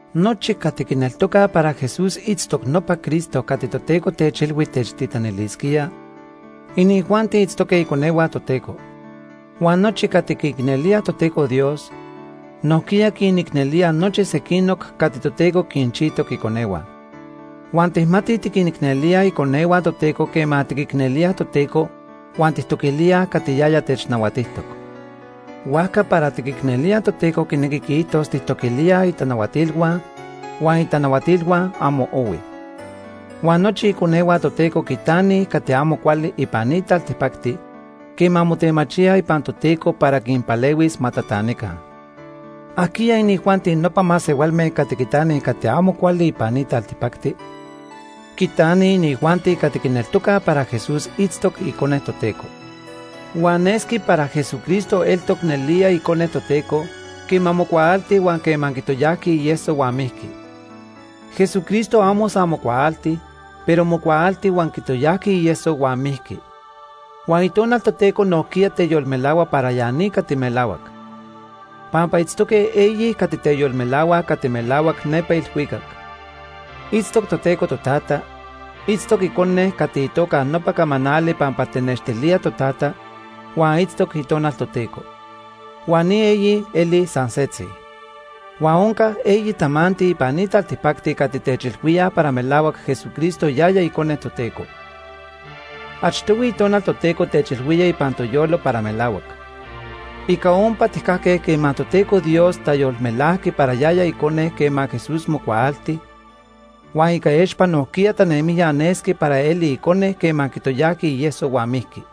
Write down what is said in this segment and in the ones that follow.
Nochi cati quineltocaj para Jesús itztoc nopa Cristo cati Toteco techilhui techtitanilisquía, inijuanti itztoque iconehua Toteco. Huan nochi cati quiicnelíaj Toteco Dios, nojquiya quinicnelíaj nopa sequinoc cati Toteco quinchijtoc iconehua. Huan tijmatij tiquinicnelíaj iconehua Toteco quema tiquicnelíaj Toteco huan tijtoquilíaj cati yaya technahuatijtoc. Huajca para tiquicnelíaj Toteco quinequi quiijtos tijtoquilíaj itanahuatilhua, huan itanahuatilhua amo ohuij. Huan nochi iconehua Toteco quitanij cati amo cuali ipan ni taltipacti quema motemachíaj ipan Toteco para quinpalehuis ma tatanica. ¿Ajquiya inijuanti nopa masehualme cati quitanij cati amo cuali ipan ni taltipacti? Quitanij inijuanti cati quineltocaj para Jesús itztoc Icone Toteco. Huan nesqui para Jesucristo eltoc nelía Icone Toteco quema mocuaalti huan quema quitoyajqui ieso huan mijqui. Jesucristo amo san mocuaalti, pero mocuaalti, huan quitoyajqui ieso huan mijqui. Huan Itonal Toteco nojquiya teyolmelahua para ya ni cati melahuac. Pampa itztoque eyi cati teyolmelahuaj cati melahuac nepa ilhuicac. Itztoc Toteco Totata, itztoc Icone cati itoca nopa “camanali” pampa tenextilía Totata, huan itztoc Itonal Toteco. Huan ni eyi elij san setzi. Huan onca eyi tamanti ipan ni taltipacti cati techilhuíaj para melahuac Jesucristo yaya icone Toteco. Achtohui Itonal Toteco techilhuía ipan toyolo para melahuac. Ica ompa tijcajque quema Toteco Dios tayolmelajqui para yaya Icone quema Jesús mocuaalti, huan ica expa nojquiya tanemijya nesqui para eli Icone quema quitoyajqui ieso huan mijqui.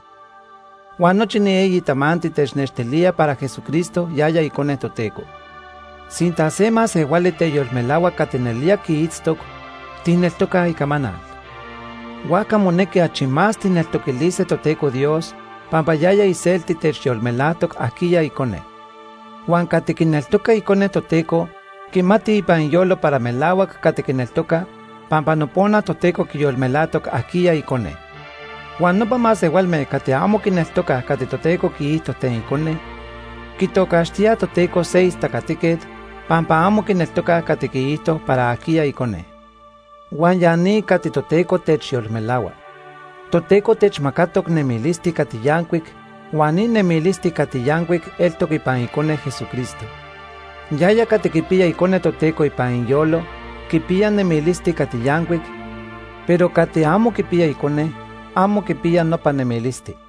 Huan nochi ni eyi tamanti technextilía para Jesucristo yaya Icone Toteco. Sinta se masehuali teyolmelahua cati nelía quiitztoc, tijneltocaj icamanal. Huajca monequi achi más tijneltoquilise Toteco Dios pampa yaya iselti techyolmelajtoc ajquiya Icone. Huan cati quineltoca Icone Toteco quimati ipan iyolo para melahuac cati quineltoca pampa nopona Toteco quiyolmelajtoc ajquiya icone. Huan nopa masehualme cati amo quineltocaj cati Toteco quiijto ten Icone, quitocaxtíaj Toteco se istacatiquet, pampa amo quineltocaj cati quiijto para ajquiya Icone. Huan ya ni cati Toteco techyolmelahua: Toteco techmacatoc nemilisti cati yancuic huan ni nemilisti cati yancuic eltoc ipan Icone Jesucristo. Yaya cati quipiya Icone Toteco ipan iyolo quipiya nemilisti cati yancuic, pero cati amo quipiya Icone, amo quipiya nopa nemilisti.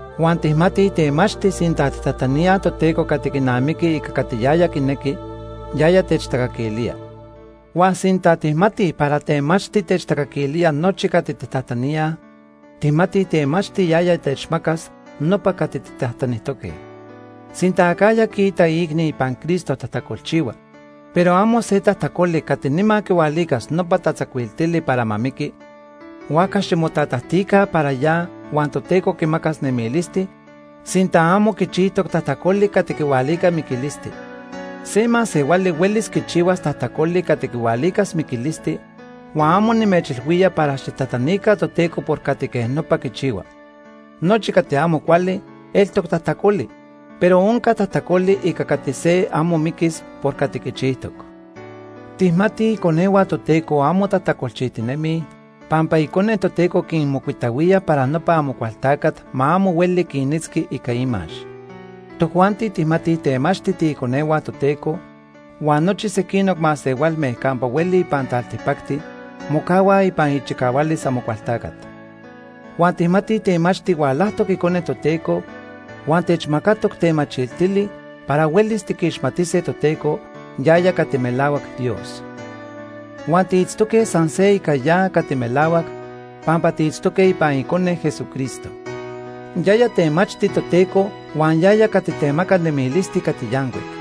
Huan tijmatij temachti sinta tijtajtaníaj Toteco cati quinamiqui ica cati yaya quinequi, yaya techtacaquilía. Huan sinta tijmatij para temachti techcaquilía nochi cati tijtajtaníaj, tijmatij temachti yaya techmacas nopa cati tijtajtanijtoque. Sinta acajya quiita iicni ipan Cristo tajtacolchihua, pero amo se tajtacoli cati nima quihualicas nopa tatzacuiltili para ma miqui, huajca ximotatajtica para ya huan Toteco quimacas nemilisti, sinta amo quichijtoc tajtacoli cati quihualica miquilisti. Se masehuali huelis quichihuas tajtacoli cati quihualicas miquilisti, huan amo nimechilhuía para xijtajtanica Toteco por cati quej nopa quichihua. Nochi cati amo cuali, eltoc tajtacoli, pero onca tajtacoli ica cati se amo miquis por cati quichijtoc. Tijmatij iconehua Toteco amo tajtacolchijtinemij pampa Icone Toteco quinmocuitahuía para nopa Amocualtacat ma amo hueli quinitzqui ica imax. Tojuanti tijmatij temachti tiiconehua Toteco huan nochi sequinoc masehualme campa hueli ipan taltipacti mocahuaj ipan ichicahualis Amocualtacat. Huan tijmatij temachti hualajtoc Icone Toteco huan techmacatoc tamachiltili para huelis tiquixmatise Toteco yaya cati melahuac Dios. Huan tiitztoque san se ica ya cati melahuac, pampa tiitztoque ipan Icone, Jesucristo. Yaya temachti Toteco huan yaya cati temaca nemilisti cati yancuic.